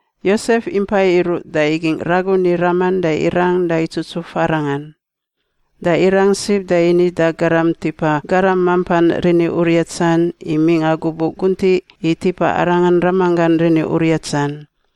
Yosef impai iruꞌ da igingꞌ ragun i raman da irang da itsutsuf arangan. Da irang sib da ini da garam tipa garam mampan riniuriatsan i mingꞌa gubuꞌ guntiꞌ i tipa arangan ramanggan riniuriatsan.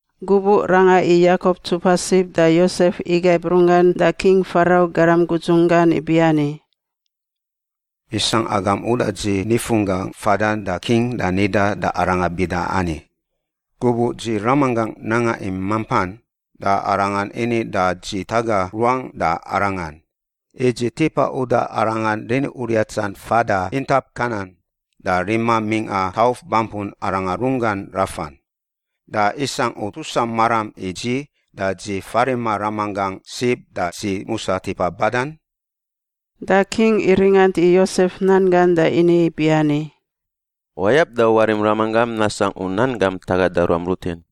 Gubuꞌ ranga i Yakop ntsupa sib da Yosef igaib runggan da King Farau garam gudzun gan ibiani, “Isangꞌ agam uda dzi nifunggangꞌ fadan da king da nidan da arangan bida ani, ‘Gubuꞌ dzi ramanggangꞌ nanga i mampan, da arangan ini da dzi taga ruangꞌ da arangan, i dzi tipa uda arangan riniuriatsan fada intap Kanan, da rima mingꞌa tauf bampun arangan runggan rafan. Da isangꞌ u tusa maram i dzi da dzi farima ramanggangꞌ sib, da dzi musa tipa badan?’” Da king iringant i Yosef nan gan da ini ibiani, “Wayab da warim ramanggam nasangꞌ u nan gam tagada ruam rutin.”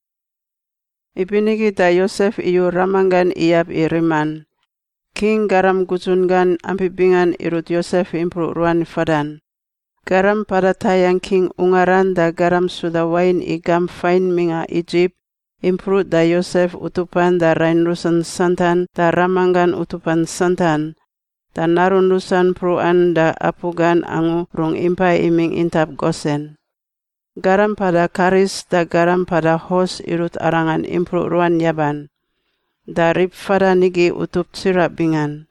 Ibinigi da Yosef iyu ramanggan iyab i riman. King garam gudzun gan ampi bingan irut Yosef impruꞌ ruan fadan — garam mpada tayangꞌ king ungaran da garam suda wain i gamp fain mingꞌa Idzip, impruꞌ da Yosef utupan da rain rusan santan da ramanggan utupan santan. Da narun rusan mpruꞌan da apu gan angu rungꞌ impa imingꞌ intap Gosen. Garam mpada karis da garam mpada hos irut arangan impruꞌ ruan yaban. Da rib fadan igi utup tsiraꞌ bingan.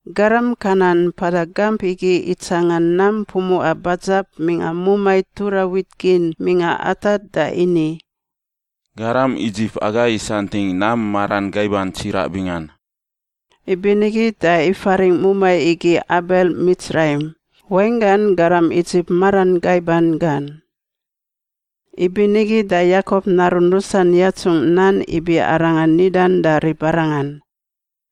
Garam Kanan mpada gamp igi itsanga nam pumuꞌa badzab mingꞌa mumai tura wit gin mingꞌa Atad da ini, “Garam Idzip aga isantingꞌ nam maran gaiban tsiraꞌ bingan.” Ibinigi da ifaringꞌ mumai igi Abel Mitsraim, wainggan “garam Idzip maran gaiban gan.” Ibinigi da Yakop narun rusan yatsungꞌ nan ibi arangan nidan da ribarangan: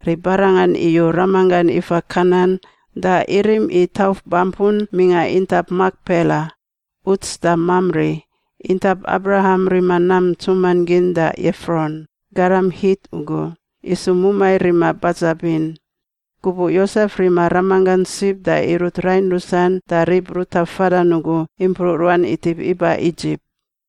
Ribarangan iyu ramanggan ifa Kanan da irim i tauf bampun mingꞌa intap Makpela, uts da Mamri, intap Abraham rima nam ntsuman gin da Efron, garam Hit ugu, isu mumai rima badzabin. Gubuꞌ Yosef rima ramanggan sib da irut rain rusan da rib ruta fadan ugu impruꞌ ruan itip iba Idzip.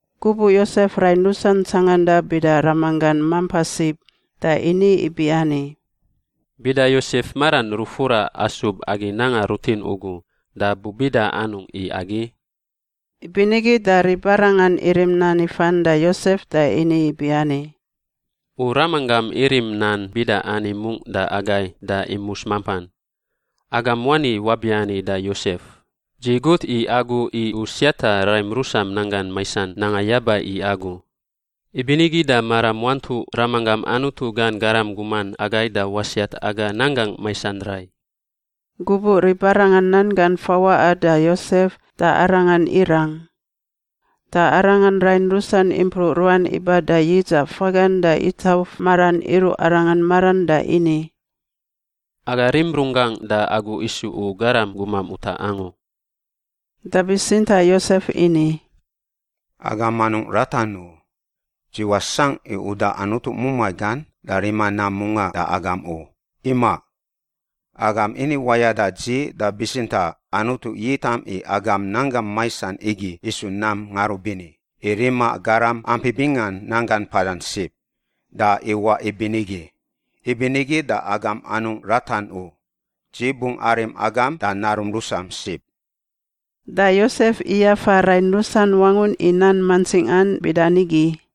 Gubuꞌ Yosef rain rusan tsanganda bida ramanggan mampa sib da ini ibiani, “Bida Yosef maran rufura asub agi nanga rutin ugu da bubida anungꞌ i agi?” Ibinigi da ribarangan irim nan ifan da Yosef da ini ibiani, “U ramanggam irim nan bida ani mungꞌ da agai da imus mampan: ‘Agam wani wabiani da Yosef: Dzi gut i agu i u siata raim rusam nanggan maisan nanga yaba i agu.’ Ibinigi da maram wantuꞌ ramanggam Anutu gan garam guman agai da wasiat aga nanggangꞌ maisan rai.” Gubuꞌ ribarangan nan gan fawaꞌa da Yosef, da arangan irang. Da arangan rain rusan impruꞌ ruan iba da yidzaꞌ fagan da itauf maran iruꞌ arangan maran da ini, “Aga rim runggangꞌ da agu isu u garam gumam utaꞌ angu.” Da bitsintaꞌ Yosef ini, “Agam anungꞌ ratan u. Dzi wasangꞌ i uda Anutu mumai gan da rima nam mungaꞌ da agam u. Imaꞌ. Agam ini wayada dzi da bitsintaꞌ Anutu yitam i agam nanggam maisan igi isu nam ngarubini, i rima garam ampi bingan nanggan mpadan sib. Da iwaꞌ ibinigi. Ibinigi da agam anungꞌ ratan u. Dzi bungꞌ arim agam da narum rusam sib.” Da Yosef iyafa rain rusan wangun i nan mantsingan bida nigi.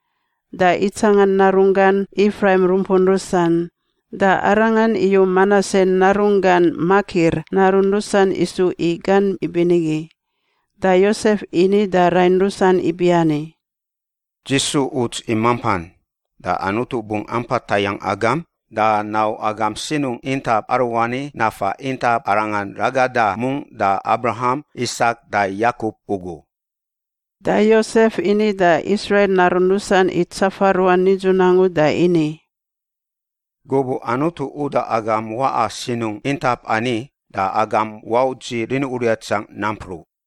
da itsangan narunggan Ifraim rumpun rusan. Da arangan iyu Manase narunggan Makir narun rusan isu i gan ibinigi. Da Yosef ini da rain rusan ibiani, “Dzi su uts i mampan. Da Anutu bungꞌ ampa tayangꞌ agam da nau agam sinungꞌ intap aruani nafa intap arangan ragada mungꞌ da Abraham, Isak da Yakop ugu.” Da Yosef ini da Israil narun rusan i tsafa ruan nidzun angu da ini, “Gubuꞌ Anutu uda agam waꞌa sinungꞌ intap ani da agam wau dzi riniuriatsangꞌ nampruꞌ.”